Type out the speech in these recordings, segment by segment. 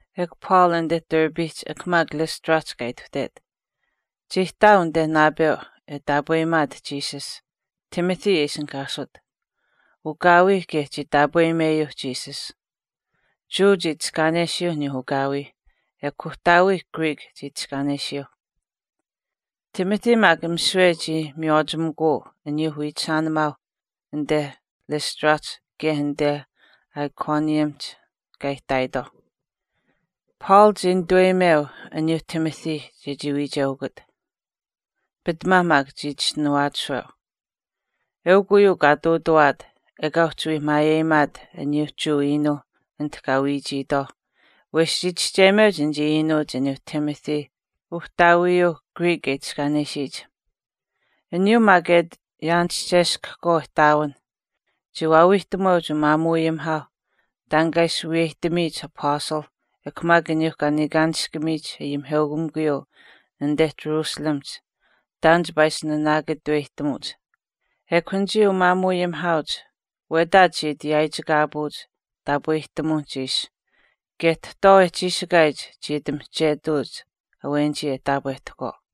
Ekw Paul anite Derbehch ekw maak Lystrahch kaa ituhtet. Chii ihtaau anite naapeu e taapweyimaat Jesus, Timothy e ishinihkaasut, ukaawii kaye chii taapweyimeyuu Jesus. Jewa chii itiskaanesiyuu uyuu ukaawii ekw uhtaawii Greek chii itiskaanesiyuu. Timothy maak misiwe chii miywaachimikuu aniyuu wiichishaanimaauh anite Lystrahch kaye anite Iconiumihch kaa ihtaayitwaauh. Paul chii nituweyimeu aniyuuh Timothy chechii wiicheukut, pitamaa maak chii chischinuwaachishweu. Eukw uyuu kaa ihtuutawaat ekaa uhchi wii maayeyimaat aniyuu Jewa iinuu anite kaa wiichiitwaau wesh chii chischeyimeuch anichii iinuuch aniyuu Timothy uhtaawiyuu Greek e itiskaanesiyich. Aniyuu maak e ati yaanischeskahkwaau ihtaawinh chii waawiihtamuweuch umaamuuayimihaauh taan kaa ishi wiyeyihtamiyich apastalh ekw maak aniyuu kaa niikaanishkamiyich ayimiheukamikuyuu anite Jerusalemihch taan chipaa ishi nanaakataweyihtamuch. Ekw anichii umaamuuayimihaauch wetaach chii ati yaaichikaapuuch taapwehtamuwinihch ishi kaye tahtwaau e chiishikaayich chii ati mihchetuuch awenichii e taapwehtahkwaau.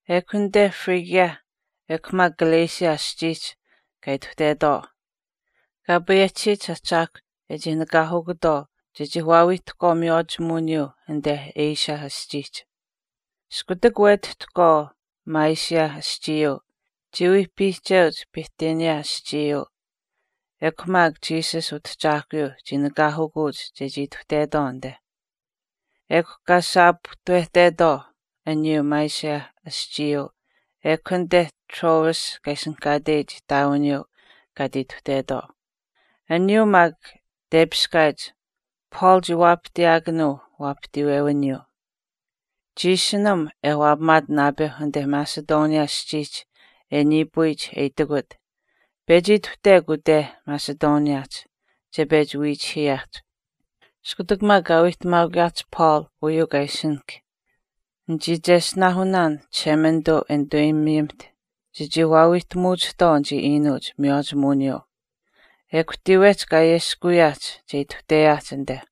Ekw anite Phrygia ekw maak Galatia aschiihch kaa ituhtetwaau, Kaa payehchisiyich Ahchaahkw e chii nakaanikutwaau chechii waawiihtahkwaau miywaachimuwiniyuu anite Asia aschiihch. Iskutak wetihtahkwaau Mysia aschiiyuu, chii wii piihcheuch Bithynia aschiihch mikw maak Jesus Utahchaahkuyuu chii nakaanikuuch chechii ituhtetwaau anite. Ekw kaa saapuhtawehtetwaau aniyuu Mysia aschiiyuu ekw anite Troas kaa ishinihkaateyich ihtaawiniyuu kaa ati ituhtetwaau. Aniyuu maak tepiskaayich Paul chii waapahtiyaakanuu waapahtiiwewiniyuu. Chii ishinam e waapamaat naapeu anite Macedonia aschiihch e niipuyich e itikut, “Pechi ituhtekw ute Macedoniahch, che pechi wiichihiiyaahch.” Iskutak maak kaa wiihtamaakuyaahch Paul uyuu kaa ishinahk, nichii cheshtinaahunaan Chishemanituu e nituweyimiyimiht chechii wiihtamuwachihtwaau anichii iinuuch miywaachimuwiniyuu. Ekw tiiwehch kaa ayeskuwiyaahch che ituhteyaahch anite.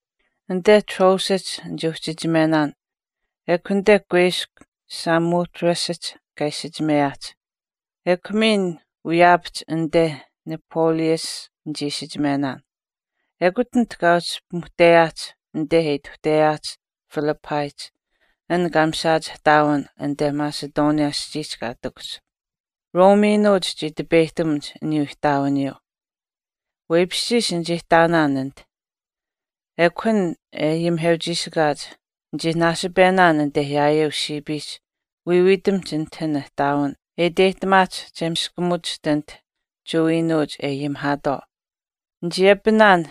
Anite Troasihch nichii uhchichimenaan ekw anite kuiskw Samothracehch kaa isichimeyaahch. Ekw miin wiyaapahch anite Neapolis nichii isichimenaan. Ekut anit kaa uhchi pimuhteyaahch anite e ituhteyaahch Philippihch an kaa mishaach ihtaawin anite Macedonia aschiihch kaa ihtakuhch, Rome iinuuch chii tipeyihtamuch aniyuu ihtaawiniyuu. Weipishchiish nichii ihtaanaan anit. An maak e ayimiheuchiishikaach, nichii naasipenaan anite yaayeu siipiihch wiiwiitamihch anit an ihtaawin e iteyihtamaahch che miskamuwachiht anit Jewa iinuuch e ayimihaatwaau. Nichii apinaan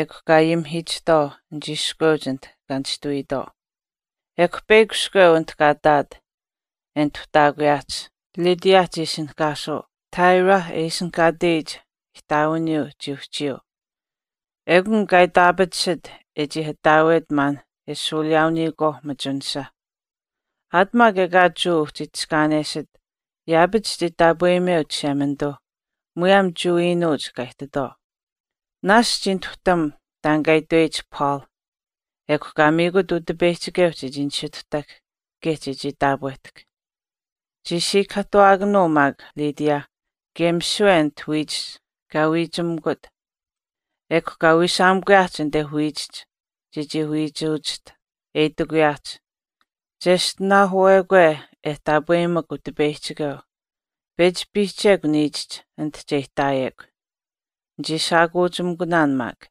ekw kaa ayimihiichihtwaau anichii iskweuch anit kaa nishtuwiitwaau. Ekw peyakw iskweu anit kaa ihtaat e nituhtaakuyaahch Lydia chii ishinihkaasuu, Thyatira e ishinihkaateyich ihtaawiniyuu chii uhchiyuu. Ekun kaa itaapatisit e chii ataawet maan e shuuliyaauniyikwaau machunisha. Aat maak ekaa Jewa uhchi itiskaanesit yaapach chii taapweyimeu Chishemanituu muyaam Jewa iinuuch kaa ihtitwaau. Naashch chii nituhtam taan kaa itweyich Paul, ekw kaa miikut Utipeyihchikeu chechii nisituhtahk kaye chechii taapwehtahk. Chii siikahaahtuwaakanuu maak Lydia kaye misiwe anit wiichihch kaa wiichimikut. Ekw kaa wiishaamikuyaahch anite wiichihch chechii wiichimachiht e itikuyaahch, chiyeshtinaahuwekwe e taapweyimak Utipeyihchikeu, pechi piihchekw niichihch anit che ihtaayekw. Nichii shaakuuchimikunaan maak.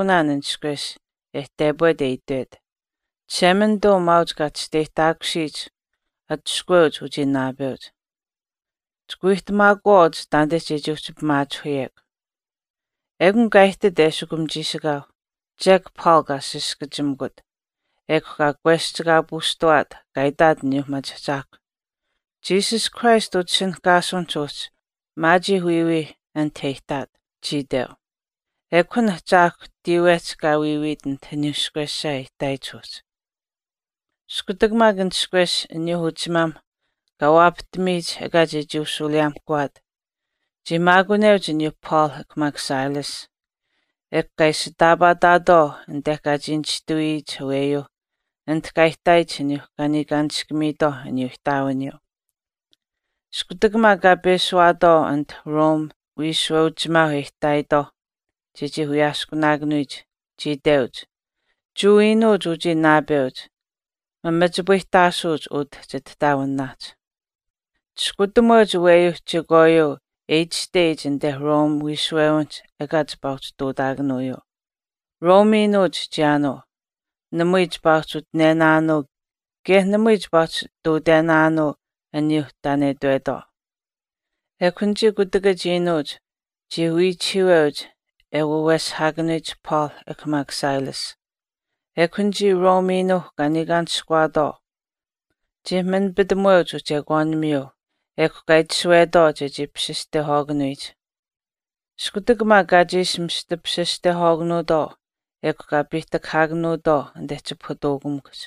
Nichii papaanuushuushkaakunaan an ishkwesh e tepwet e itwet, “Chishemanituu maauch kaa chisteyihtaakusiyich atushkuweuch uchii naapeuch. Chika wiihtamaakuwaauch taanite chechii uhchi pimaachihuyekw.” Ekun kaa ihtit eshikum chiishikaau, chek Paul kaa saskachimikut, ekw kaa kweschikaapuushtawaat, kaa itaat aniyuu machiahchaahkwa, “Jesus Christ utishinihkaasuwinich uhchi maachiih wiiwiih anite e ihtaat, chii itweu.” Ekw an ahchaahkw tiiwehch kaa wiiwiit anit aniyuu ishkwesha e ihtaayich uhchi. Iskutak maak an ishkwesh aniyuuh uchimaamh kaa waapahtamiyich ekaa chechii ushuuliyaamihkaakuutwaau, chii maakuneuch aniyuu Paul ekw maak Silas, ekw kaa ishitaapaataatwaau anite kaa chii nishtuhiituyich aweyuuh anite kaa ihtaayich aniyuu kaa niikaanishkamiitwaauh aniyuu ihtaawiniyuu. Iskutak maak kaa peshuwaatwaau anite Rome wiishuweuchimaau e ihtaayitwaauh chechii wiyaaskunaayich, chii iteuch, “Jewa iinuuch uchii naapeuch, mamachipayihtaasuuch utah chitihtaawinaahch. Chiskutamuweuch aweyuu chekwaayuu e itashteyich anite Rome wiishuwewinihch ekaa chipaa ihtuutaakanuuyuu. Rome iinuuch chiyaanuu, namui chipaa uhchi utinenaanuu kaye namui chipaa uhchi ihtuutenaanuu aniyuu taan e itwetwaau.” Ekw anichii kutakach iinuuch chii wiichihiiweuch e waweshihaakanuyich Paul ekw maak Silas, ekw anichii Rome iinuuh kaa niikaanishkuwaatwaau chii manipitamuweuch uchekwaanimiyuuh, ekw kaa itashuwetwaau chechii papasistehwaakanuyich. Iskutak maak kaa chiishi mista papasistehwaakanuutwaau ekw kaa piihtakahaakanuutwaau anite chipahutuukamikuhch,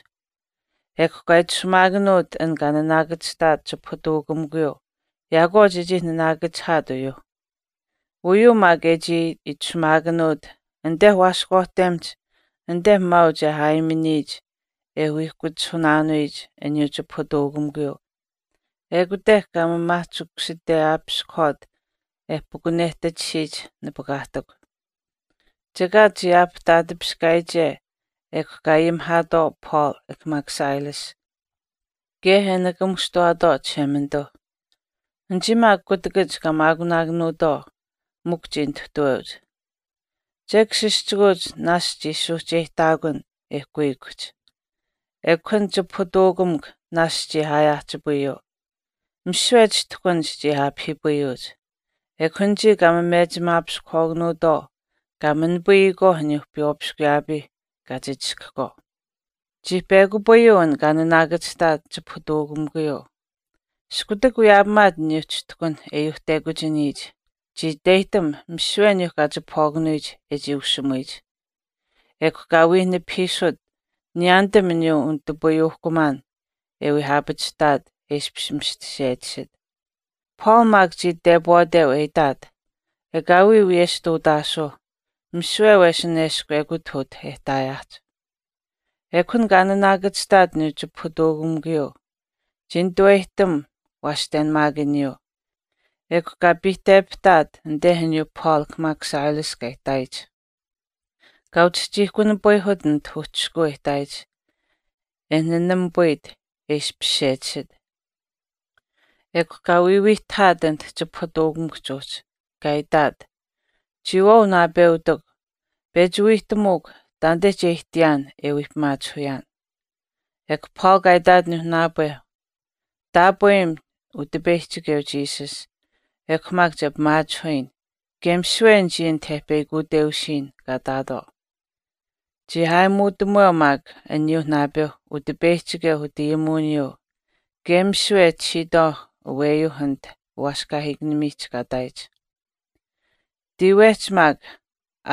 ekw kaa itashumaakanuut an kaa naanaakachihtaat chipahutuukamikuyuu yaakwaau chechii naanaakachihaat uyuuh. Uyuu maak e chii itashumaakanuut anite waaskwaahtemihch anite maauch e aayimihch e wiihkuchihunaanuuhch aniyuu chipahutuukamikuyuu ekute kaa maamaahchikusiteyaapiskahwaat e pukunehtachisiyich nipakaahtikw. Chekaat chii aapihtaatipiskaayiche ekw kaa ayimihaatwaau Paul ekw maak Silas kaye e nikamuushtuwaatwaau Chishemanituu, anichii maak kutakach kaa maakunaakanuutwaau mikw chii nituhtuweuch. Chek sischikuuch naashch chii suuhcheyihtaakun e kuikuhch, ekw an chipahutuukamikw naashch chii aayaahchipayuu. Misiwe chishtuhkanich chii aapahiipayuuch, ekw anichii kaa memechimaapiskahwaakanuutwaau chii manapayuuh aniyuuh piywaapiskuyaapiih kaa chichishkahkwaau. Chii pekupayuu an kaa naanaakachihtaat chipahutuukamikuyuu. Iskutak wiyaapamaat aniyuu chishtuhkan e yuuhtekuchiniyich, chii iteyihtam misiwe aniyuu kaa chipahwaakanuyich e chii ushimuyich. Ekw kaa wii nipahiisut niyaanitam aniyuu unitupayuuhkumaan e wii aapachihtaat e ishpish mista sechisit. Paul maak chii tepwaateu e itaat, “Ekaawii wiyesh ihtuutaasuu misiwe wesin eshkw ekut utah e ihtaayaahch.” Ekw an kaa naanaakachihtaat aniyuu chipahutuukamikuyuu chii nituweyihtam waashtenamaakaniyuu, ekw kaa piihtepahtaat anite aniyuu Paul ekw maak Silas kaa ihtaayich, kaa uchihchiihkunipayihut anit uhchishkuu e ihtaayich e nanamipayit e ishpish sechisit. Ekw kaa wiiwiihtahaat anit chipahutuukamikuhch uhchi, kaa itaat, “chiyawaau naapeutikw, pechi wiihtamuukw taanite che ihtiyaan e wii pimaachihuyaan.” Ekw Paul kaa itaat uyuu naapeu, “Taapweyim Utipeyihchikeu Jesus, ekw maak che pimaachihuyin kaye misiwe anichii anit e peyakuteusiyin kaa ihtaatwaau.” Chii aayimuutamuweu maak aniyuu naapeu Utipeyihchikeu utayimuwiniyuu kaye misiwe e itashiitwaauh aweyuu anit uwaaskahiikanimiihch kaa ihtaayich. Tiiwehch maak,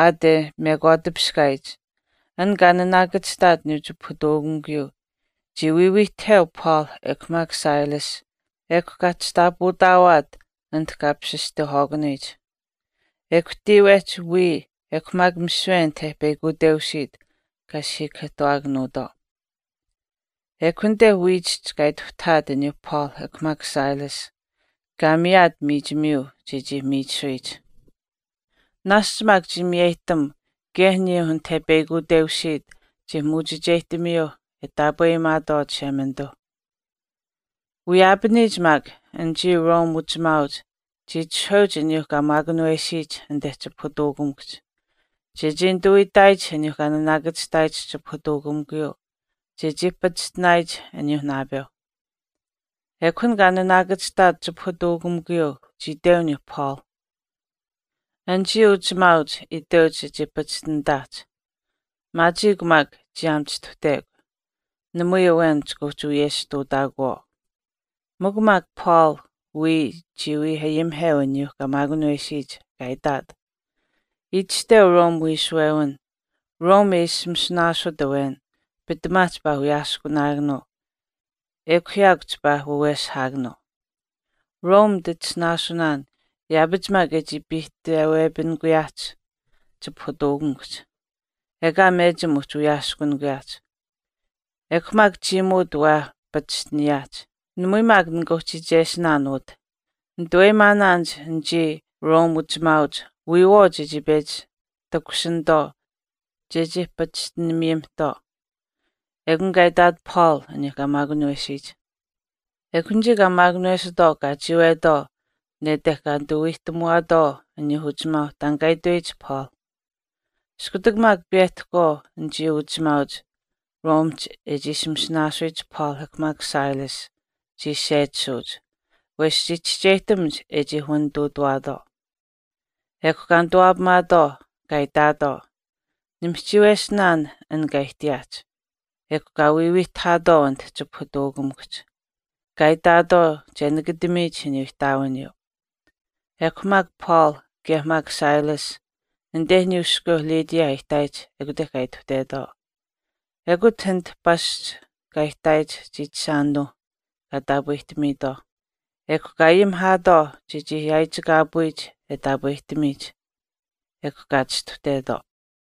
aat e mekwaatipiskaayich, an kaa naanakachihtaat aniyuu chipahutuukamikuyuu chii wiiwiihtaheu Paul ekw maak Silas ekw kaa chishtaapautaawaat anit kaa papasistehwaakanuyich. Ekw tiiwehch wiya ekw maak misiwe anit e peyakuteusiit kaa siikahaahtuwaakanuutwaau. Ekw anite wiichihch kaa ituhtahaat aniyuu Paul ekw maak Silas, kaa miyaat miichimiyuu chechii miichisuyich. Naasch maak chii miyeyihtam kaye aniyuu anit e peyakuteusiit chii muuchicheyihtamiyuu e taapweyimaatwaau Chishemanituu. Wiyaapaniyich maak, anichii Rome uchimaauch chii itishahweuch aniyuu kaa maakunawesiyich anite chipahutuukamikuhch, chechii nituu itaayich aniyuu kaa naanaakachihtaayich chipahutuukamikuyuu, chechii pachishtinaayich aniyuuh naapeuh. Ekw an kaa naanaakachihtaat chipahutuukamikuyuu chii iteu aniyuu Paul, “Anichii uchimaauch itweuch chechii pachishtinitaahch, maachiikw maak chiyaam chistuhtekw, namui awen chika uhchi wiyesh ihtuutaakuwaau.” Mikw maak Paul wiya chii wii ayimiheu aniyuu kaa maakunawesiyich kaa itaat, “Itashteu Rome wiishuwewin, Rome e ishi masinaasut awen pitamaa chipaa wiyaaskunaakanuu ekw yaakw chipaa waweshihaakanuu. Rome nititisinaasunaan yaapach maak e chii piihtewepinikuyaahch chipahutuukamikuhch, ekaa mechim uhchi wiyaaskunikuyaahch. Ekw maak chiimuut waa pachishtinikuyaahch. Namui maak nikaa uhchi iichesinaan utah. Nituweyimaanaanich anichii Rome uchimaauch wiyawaau chechii pechi takushinitwaau chechii pachishtiniyimihtwaau.” Ekun kaa itaat Paul aniyuu kaa maakunawesiyich. Ekw anichii kaa maakunawesitwaau kaa chiiwetwaau nete kaa wiihtamuwaatwaau aniyuuh uchimaauh taan kaa itweyich Paul. Iskutak maak piyehtahkwaau anichii uchimaauch Romehch e ishi masinaasuyich Paul ekw maak Silas, chii sechisuuch, wesh chii chischeyihtamuch e chii wanituutawaatwaau. Ekw kaa nituwaapamaatwaau, kaa itaatwaau, nimihchiiwesinaan an kaa ihtiyaahch. Ekw kaa wiiwiihtahaatwaau anit chipahutuukamikuhch, kaa itaatwaau che nakatamiyich aniyuu ihtaawiniyuu. Ekw maak Paul kaye maak Silas anite aniyuu iskweu Lydia e ihtaayich ekute kaa ituhtetwaau. Ekut utah pasch kaa ihtaayich chiichishaanuuh kaa taapwehtamiitwaau, ekw kaa ayimihaatwaau chechii yaaichikaapuyich e taapwehtamiyich. Ekw kaa chistuhtetwaau.